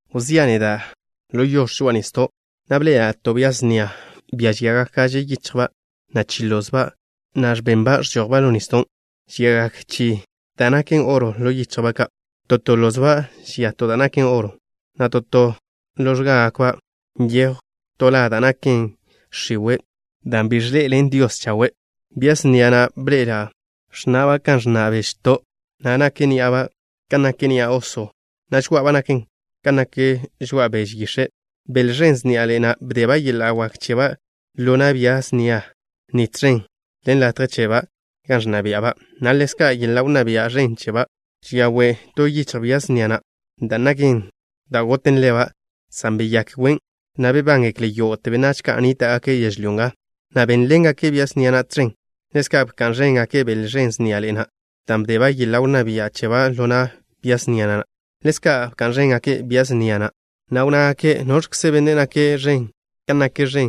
Wzía' neda' ḻo yox̱ žoa'a nisdo', na' bḻe'ela' to bia snia, bia žiagak gaže yichjba', na' chi lozba', na' ẕbenba' ẕžojba' ḻo nisdon'. Žiagak chi da' naken oro ḻo yichjba' ka'. To to lozba' žia to da' naken oro, na' to to ḻo x̱gaba' ka' nyejw to la da' naken x̱iwe' dan' bi de Dios chawe'. Bia snia na' bḻe'ela' ẕnna'ba' kan ẕnna' bežto', na' nak ní'aba' kan nak ni'a oso, na' žoá'aba' naken kan nak žoa'a beže yix̱e'. Bele ẕen sniaḻe'e na' bdeba' yeḻa' wak cheba' ḻo na' bia snia ni tẕen ḻen latje cheba' gan ẕnna bia'ba', na' ḻezka' yeḻa' wnná bia' ẕen cheba'. Žia we' to yichj bia snia na', da' naken da' goten leba', san beyák wen', na' bebángekle yógo'te benách ka' nníta'gake' yežlyó nga, na' bénḻengake' bia snia na' tẕen. Ḻezka' bka'n ẕéngake' bele ẕen sniaḻe'e na' dan' bdeba' yeḻa' wnná bia' cheba' ḻo na' bia snia na'. Ḻezka' bka'n ẕéngake' bia snia na', na' wnnágake': “¿Noẕkze benne' nake' ẕen kan nak ẕen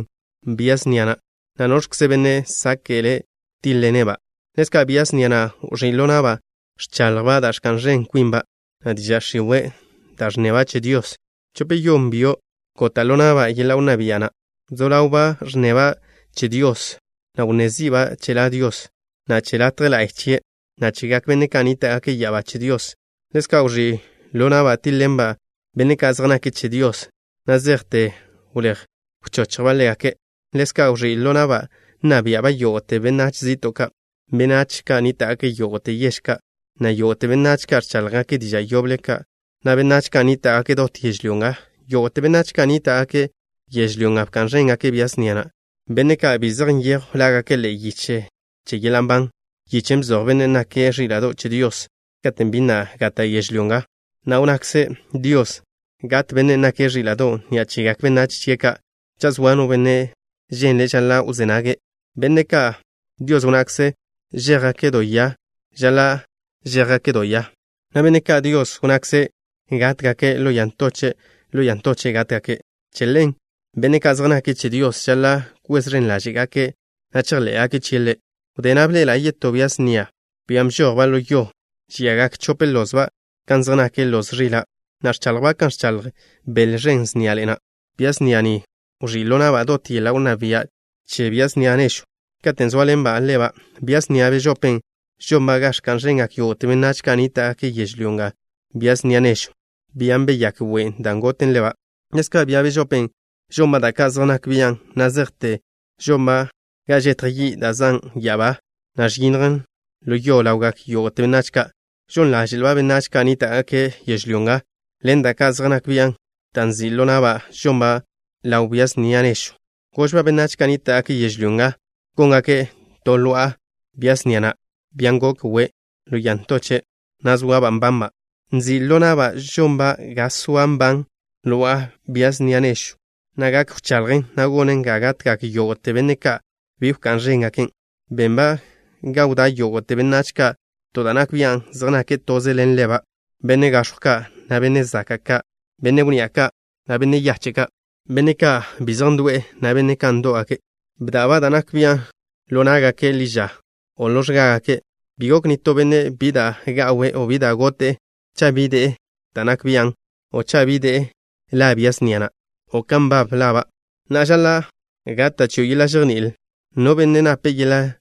bia snia na', na' noẕkze benne' sáke'le' tíḻ-ḻene'-ba'?” Ḻezka' bia snia na' wẕí' ḻo na'ba' ẕchaḻjba' da' ẕka'n ẕen kwinba', na' diža' x̱iwe' da' ẕnneba' che Dios. Chope-yon byo' gota' ḻo na'ba' yeḻa' wnná bia' na'. Wzó ḻawba' ẕnneba' che Dios, na' wnné zi'ba' che La Dios, na' che latje la'y chie', na' chegak benne' ka' nníta'gake' ya'abá che Dios. Ḻezka' wẕí' ḻo na'ba' tíḻ-ḻenba' benne' ka' zej nake' che Dios, na' zejte wléj wchochjba' ḻégake'. Ḻezka' wẕí' ḻo na'ba' nna bia'ba' yógo'te benách zi'to', benách ka' nníta'gake' yógo'te yež ka', na' yógo'te benách ka' ẕcháḻjgake' diža' yoble ka', na' benách ka' nníta'gake' dot yežlyó nga. Yógo'te benách ka' nníta'gake' yežlyó nga bka'n ẕéngake' bia snia na', benne' ka' bi zej nyejw lágake' ḻe'e yiche che yeḻa' nban, yichen' bzoj Bennen' nake' Ẕíla'do' che Dios katen' bi na' gata' yežlyó nga, na' wnnakze Dios gat Bennen' nake' Ẕíla'do' ni'a chegak benách chie' ka'. Cha' zoa no benne' ženle', žaḻa' wzé nage'. Benne' ka' Dios wnnakze' žéjgake' do ya, žaḻa' žéjgake' do ya, na' benne' ka' Dios wnnakze' gátgake' ḻo ya ntoche', ḻo ya ntoche' gátgake'. Che ḻen, benne' ka' zej nake' che Dios žaḻa' kwez ẕen ḻáže'gake' na' chejḻé'gake' chie' Ḻe'. Wdé na' bḻe'ela' yetó bia snia, bian' bžojba' ḻo yo. Žiagak chope lozba' kan zej nak loz ẕila', na' ẕchaḻjba' kan ẕchaḻj bele ẕen sniaḻe'e na'. Bia snia ni wẕí' ḻo na'ba' dot yeḻa' wnná bia' che bia snia nežwn', katen' zóaḻenba' ḻeba'. Bia snia bežopen' žonba' ga ẕka'n ẕengak yógo'te benách ka' nníta'gake' yežlyó nga bia snia nežwn', bian' beyák wen' da' goten leba'. Ḻezka' bia bežopen' žonba' da' ka' zej nak bian' na' zejte žonba' ga žetj yi' da' zan' ya'abá, na' ẕyinnjen ḻo yo ḻawgak yógo'te benách ka'. Žon ḻáze'lba' benách ka' nníta'gake' yežlyó nga ḻen da' ka' zej nak bian' dan' nzi' ḻo na'ba' žonba' ḻaw bia snia nežwn'. Gožba' benách ka' nníta'gake' yežlyó nga góngake' to lo'a bia snia na', bian' gok we' ḻo ya ntoche', na' zoaba' nbanba'. Nzi' ḻo na'ba' žonba' ga soa nban lo'a bia snia nežwn', na' gak wchaḻjen, na' gonen ga gatgak yógo'te benne' ka' bi wká'n ẕéngaken'. Benba' ga wdá' yógo'te benách ka' to da' nak bian' zej nake' toze ḻen leba', benne' gax̱jw ka', na' benne' zaka' ka', benne' wnni'a ka', na' benne' yache' ka', benne' ka' bi zej ndo'e, na' benne' ndo'w ka'. Bda'ba' da' nak bian' ḻo ná'gake' ḻi ža o ḻo x̱gágake'. Bi gok nitó benne' bi da' ga'we' o bi da' gote'e cha' bi de'e da' nak bian', o cha' bi de'e la bia snia na', o kan nbab laba'. Na'a žaḻa' gata' chio' yeḻa' žejní'il. No benne' nape' yeḻa'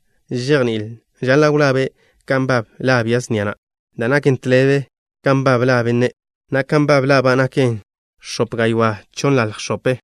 žejní'il žaḻa' wlabe' kan nbab la bia snia na', da' naken tḻebe kan nbab la benne', na' kan nbab laba' naken x̱ope gaywá' chonnḻalj x̱ope.